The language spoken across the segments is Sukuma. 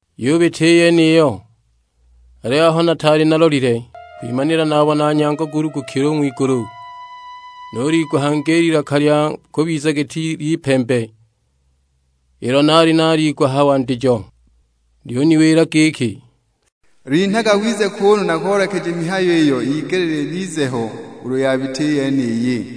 Yubita i yeniyo; aliyo aho nataali nalolile, kwimanila nabona nyango gulugukile u ng'wigulu. Nuliigwa hangi i lilaka i lya kubiza giti ly'ipembe, ilo naali naliigwa a ha wandijo. Lyuniwila giki, "Linhaga wize kuunu nakoolekeje mihayo iyo yigelile ibize ho ulu yabita i yeniyi."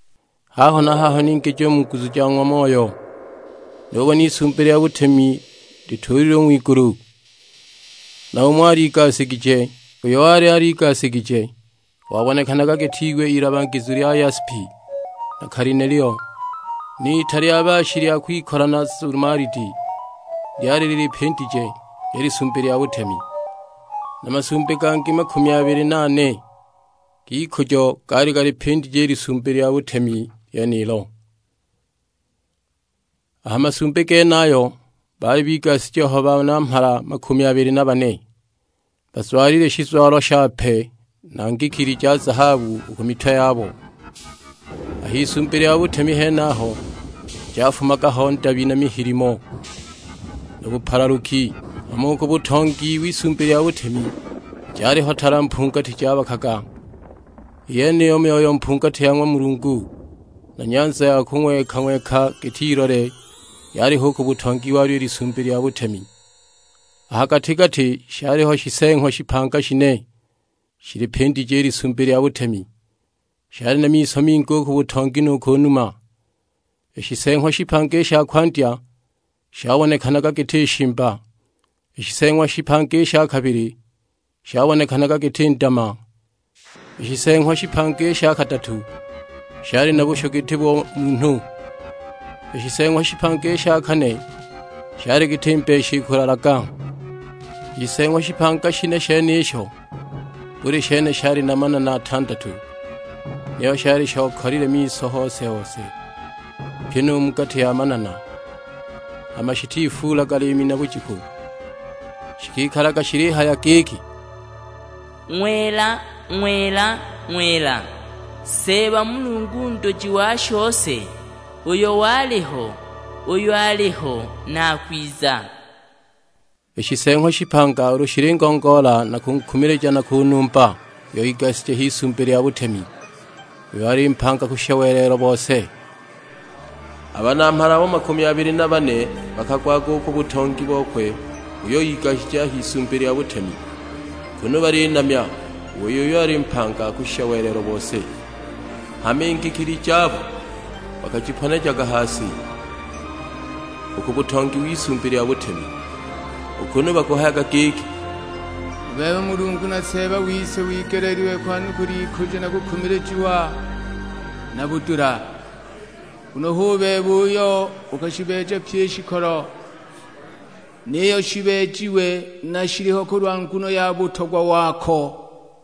Haho na haho ningijiwa mu nguzu ja ng'wa Moyo; nubona Isumbi lya butemi lituulilwe u ng'wigulu, na umo aligasigije. Uyo wali aligasigije wabonekanaga giti iwe ilabagizu lya yaspi na kalinelio, n'ita lya baashi lya kwikola na zumalidi lyali lilipindije i Lisumbi lya butemi. Na masumbi gangi makumi abili na ane g'ikujo gaali galipindije i Lisumbi lya butemi lyenilo; a ha masumbi genayo baali bigashije ho Banamhala makumi abili na bane, bazwalile shizwalo shape na ngikili ja zahabu u ku mitwe yabo. A h'Isumbi lya butemi henaho jafumaga ho ndabi na mihilimo na bupalaluki; hama u ku butongi w'Isumbi lya butemi jaliho tala mpungati jabakaga, i yeniyo Myoyo mpungati ya ng'wa Mulungu. Na nyanza ya kung'weka-ng'weka giti ilole yaliho u ku butongi walyo i Lisumbi lya butemi. A ha gati-gati shaliho Shiseeng'wa shipanga shine shilipindije i Lisumbi lya butemi; shali na miso mingi u ku butongi nu ku numa. I Shiseeng'wa shipanga i sha kwandya shabonekanaga giti shimba; i Shiseeng'wa shipanga i sha kabili shabonekanaga giti ndama, i Shiseeng'wa shipanga i sha kadatu shali na bushu giti bo munhu, i Shiseeng'wa shipanga i sha kane shali giti mbeshi ikulalaga. I Shiseeng'wa shipanga shine shenisho buli shene shali na manana atandatu, niyo shali shokalile miso hose-hose, pyi nu mu gati ya manana; hama shitifuulaga liimi na bujiku, shikikalaga shilihaya giki, "Ng'wela, Ng'wela, Ng'wela; Seeba Mulungu nduji wa shose, uyo waliho, uyo aliho, na akwiza!" I Shiseeng'wa shipanga ulu shilingongoola na kunkumilija na kunumba uyo igashije h'Isumbi lya butemi, uyo ali mpanga kushisha welelo bose, a Banamhala abo makumi abili na bane bakagwaga u ku butongi bokwe uyo igashije a h'Isumbi lya butemi, kunu balinamya, u wei uyo ali mpanga kushisha welelo bose. Hama i ngikili jabo bakajiponejaga ha si u ku butongi w'Isumbi lya butemi, u kunu bakuhayaga giki, "U bebe Mulungu na Seeba wise wigeleelilwe kwanukula ikujo na kukumilijiwa, na budula. Nguno hu bebe uyo ukashibeeja pyi i shikolo, niyo shibeejiwe na shiliho kulwa nguno ya butogwa wako!"